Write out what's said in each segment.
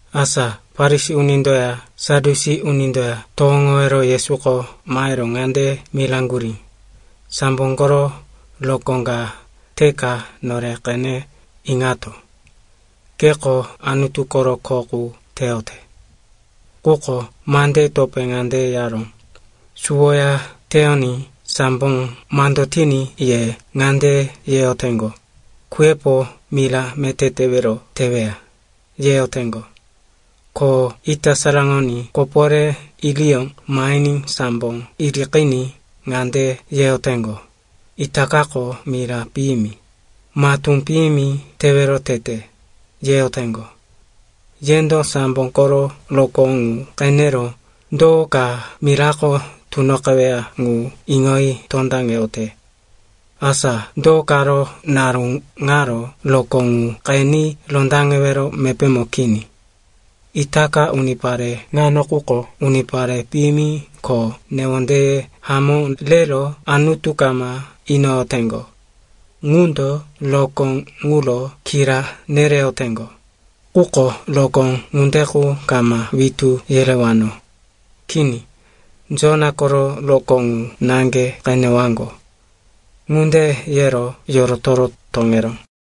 Asa Farisi unindoya Sadyusi unindoya towoŋowero Yesuko mahero ŋande miraŋgurí, “Sambo koro rokó ka teka nore qene iŋato, keko Anutu koro kho qu teyote.” Quko mandeye topé ŋande yaró, “Suwoya teyoní sambo mando tiní ye ŋande yeyoteŋgo, ‘Kuyepo mira meté tewero teweya,’ yeyoteŋgo. Ko ita saraŋoní koporé iriyó mahiní sambo iriqiní ŋande yeyoteŋgo, ‘Itakako mira piyimi, matú piyimi tewero tete,’ yeyoteŋgo. Yendo sambo koro rokó ŋu qenero do ka mirako tunoqeweya ŋu iŋoyi tondaŋeyote. Asa do karo naru ŋaro rokó ŋu qeni rondaŋewero mepémo kini? Itaka unipare ŋano quko unipare piyimi ko newondeye hamó rero Anutu kama inoyoteŋgo. Ŋundo rokó ŋuro kira nereyoteŋgo, quko rokó ŋunde qu kama witú yerewano. Kini, Jona koro rokó ŋu naŋge qenewaŋgo.” Ŋunde yero yorotoro toŋeró.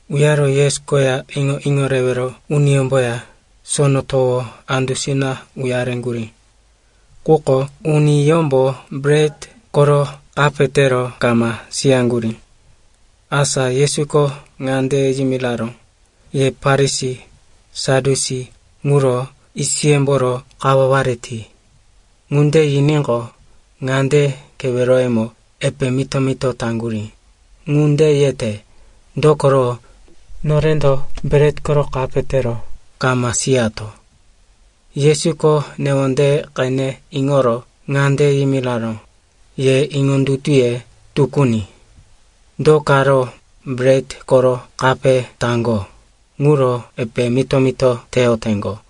Uyaro Yesu koya iŋo-iŋo rewero uniyómboya sono towo andusina uyareŋgurí. Quko uniyómbo bret koro kape tero kama siyaŋgurí. Asa Yesuko ŋande yimiraró, “Ye Farisi, Sadyusi ŋuro yisiyemboro kawaware ti.” Ŋunde yiníqo, ŋande keweroyemo epe mito-mito taŋgurí, “Ŋunde yete, dokoro norendo bret koro kape tero kama siyato.” Yesuko newondeye qene iŋoro ŋande yimiraró, “Ye iŋondutuye tukuni! Do karo bret koro kape taŋgo ŋuro epe mito-mito teyoteŋgo?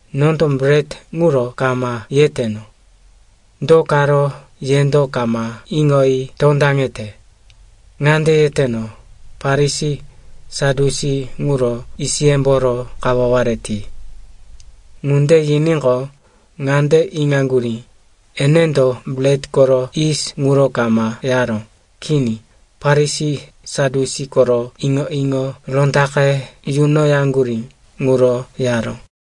Nondo bret ŋuro kama yeteno. Do karo yendo kama iŋoyi tondaŋete? Ŋande yeteno, Farisi, Sadyusi ŋuro yisiyemboro kawaware ti.” Ŋunde yiníqo, ŋande iŋaŋgurí, enendo bret koro yis ŋuro kama yaró, kini, Farisi, Sadyusi koro iŋo-iŋo rondaqe yunoyaŋgurí ŋuro yaró.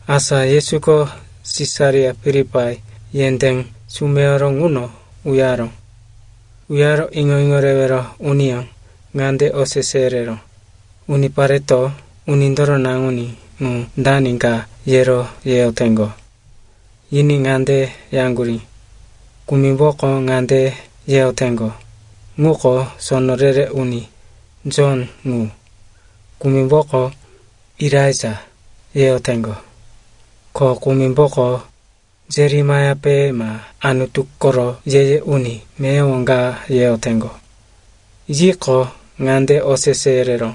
Asa Yesuko Sisaria Filipai yendé sumeyoro ŋuno uyaró. Uyaro iŋo-iŋo rewero uniyó ŋande osese yereró, “Unipareto Unindoro Naŋuní ŋu dani ka yero yeyoteŋgo?” Yiní ŋande yaŋgurí, “Kumimboko ŋande yeyoteŋgo, ŋuko sono re-re uni, Jon ŋu. Kumimboko, Elaija, yeyoteŋgo. Ko kumimboko, Jeremaiape ma Anutu koro ye-ye uni meyowo ka, yeyoteŋgo.” Yiqo, ŋande osese yereró,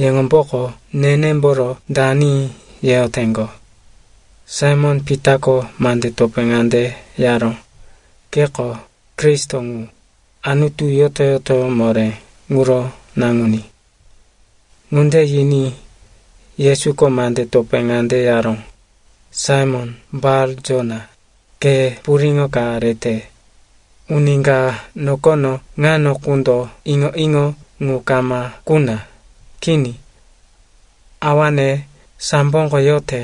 “Yeŋomboko nenemboro dani yeyoteŋgo?” Saimon-Pitako mande topé ŋande yaró, “Keko Kristo ŋu, Anutu Yoto-yotoyó Moré ŋuro Naŋuní.” Ŋunde yiní Yesuko mande topé ŋande yaró, “Saimon Bar-Jona, ke puriŋo ka rete. Uni ka nokono ŋano qundo iŋo-iŋo ŋu kama kuna. Kini. Awane samboko yote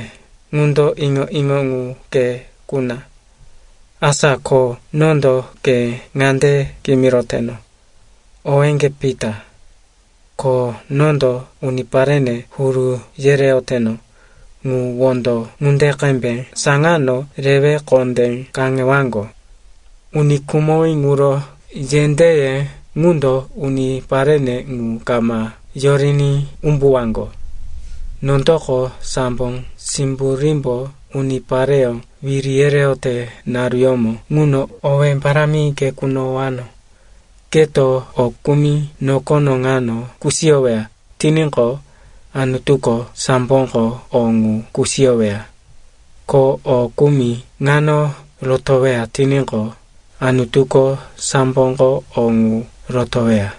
ŋundo iŋo-iŋo ŋu ke kuna. Asa ko nondo ke ŋande kimiroteno. Owéŋge Pita, ko nondo uniparene huru yereyoteno ŋu wondo ŋunde qembe saŋano rewe kondé kaŋewaŋgo. Uni khumowí ŋuro yendéye ŋundo uniparene ŋu kama yoriní umbuwaŋgo. Nondoko sambo simburímbo unipareyó wiri yereyote naruyómo ŋuno owé parámi ke kunowano. Keto o kumi nokono ŋano kusiyoweya tiníqo, Anutuko samboko o ŋu kusiyoweya, ko o kumi ŋano rotoweya tiníqo, Anutuko samboko o ŋu rotoweya.”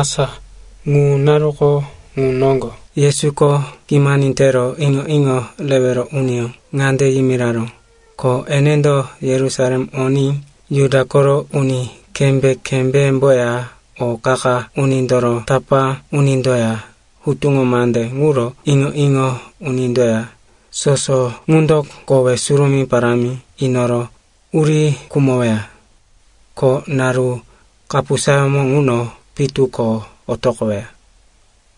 Asa ŋu naruko ŋu noŋgo Yesuko kimani tero iŋo-iŋo rewero uniyó ŋande yimiraró, ko enendo Yerusalem oní Juda koro uni kembé-kembéyemboya o qa-qa unindoro tapá unindoya hutuŋo mande ŋuro iŋo-iŋo unindoya soso ŋundo kowe surumí parámi inoro uri khumoweya. Ko naru kapusayómo ŋuno pitu ko otoqoweya.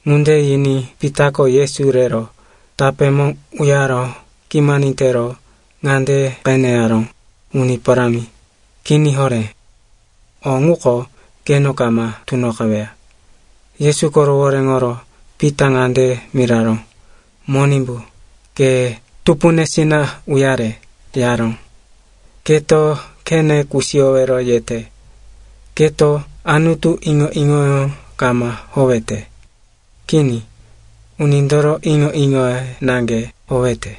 Ŋunde yiní Pitako Yesu rero tapémo uyaro kimani tero ŋande qene yaró, “Uni Parámi, kini horé. O ŋuko keno kama tunoqeweya.” Yesuko rohoréŋoro Pita ŋande miraró, “Monimbu, ke tupunesina uyare,” yaró. “Keto khene kusiyowero yete. Keto Anutu iŋo-iŋoyó kama howete. Kini. Unindoro iŋo-iŋoye naŋge howete.”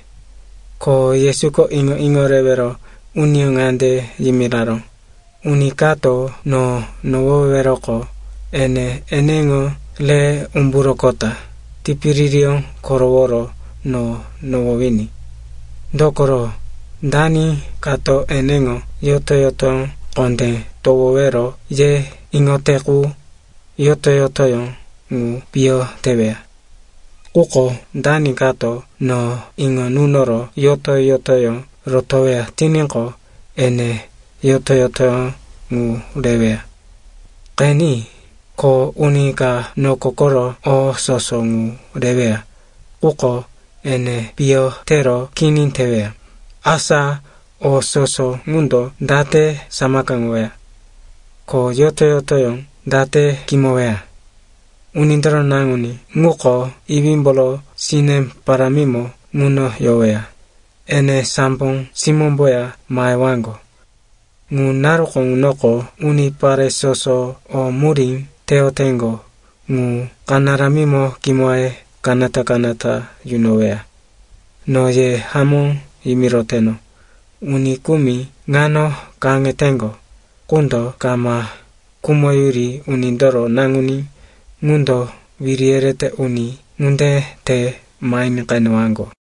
Ko Yesuko iŋo-iŋo rewero uniyó ŋande yimiraró, “Uni kato no nohoweweroqo, ene eneŋo re umburoqota, tipiririyó koroworo no nohowiní. Dokoro, dani kato eneŋo yoto-yotoyó kondé towowero ye iŋote qu, yoto-yotoyó ŋu piyo teweya. Quko dani kato no iŋo nunoro yoto-yotoyó rotoweya tiníqo, ene yoto-yotoyó ŋu reweya. Qeni, ko uni ka noko koro o soso ŋu reweya, quko ene piyo tero kini teweya, asa o soso ŋundo date samakaŋoweya? Ko yoto-yotoyó date kimoweya? Unindoro Naŋuní ŋuko iwímboro sine parámimo ŋuno yoweya, ene sambo simómboya mahewaŋgo. Ŋu naruko ŋunoko unipare soso o murí teyoteŋgo ŋu kanaramimo kimoye kanata-kanata yunoweya. No ye hamó yimiroteno, uni kumi ŋano kaŋeteŋgo qundo kama khumoyuri Unindoro Naŋuní ŋundo wiri yerete uni ŋunde te mahiní qenewaŋgo.”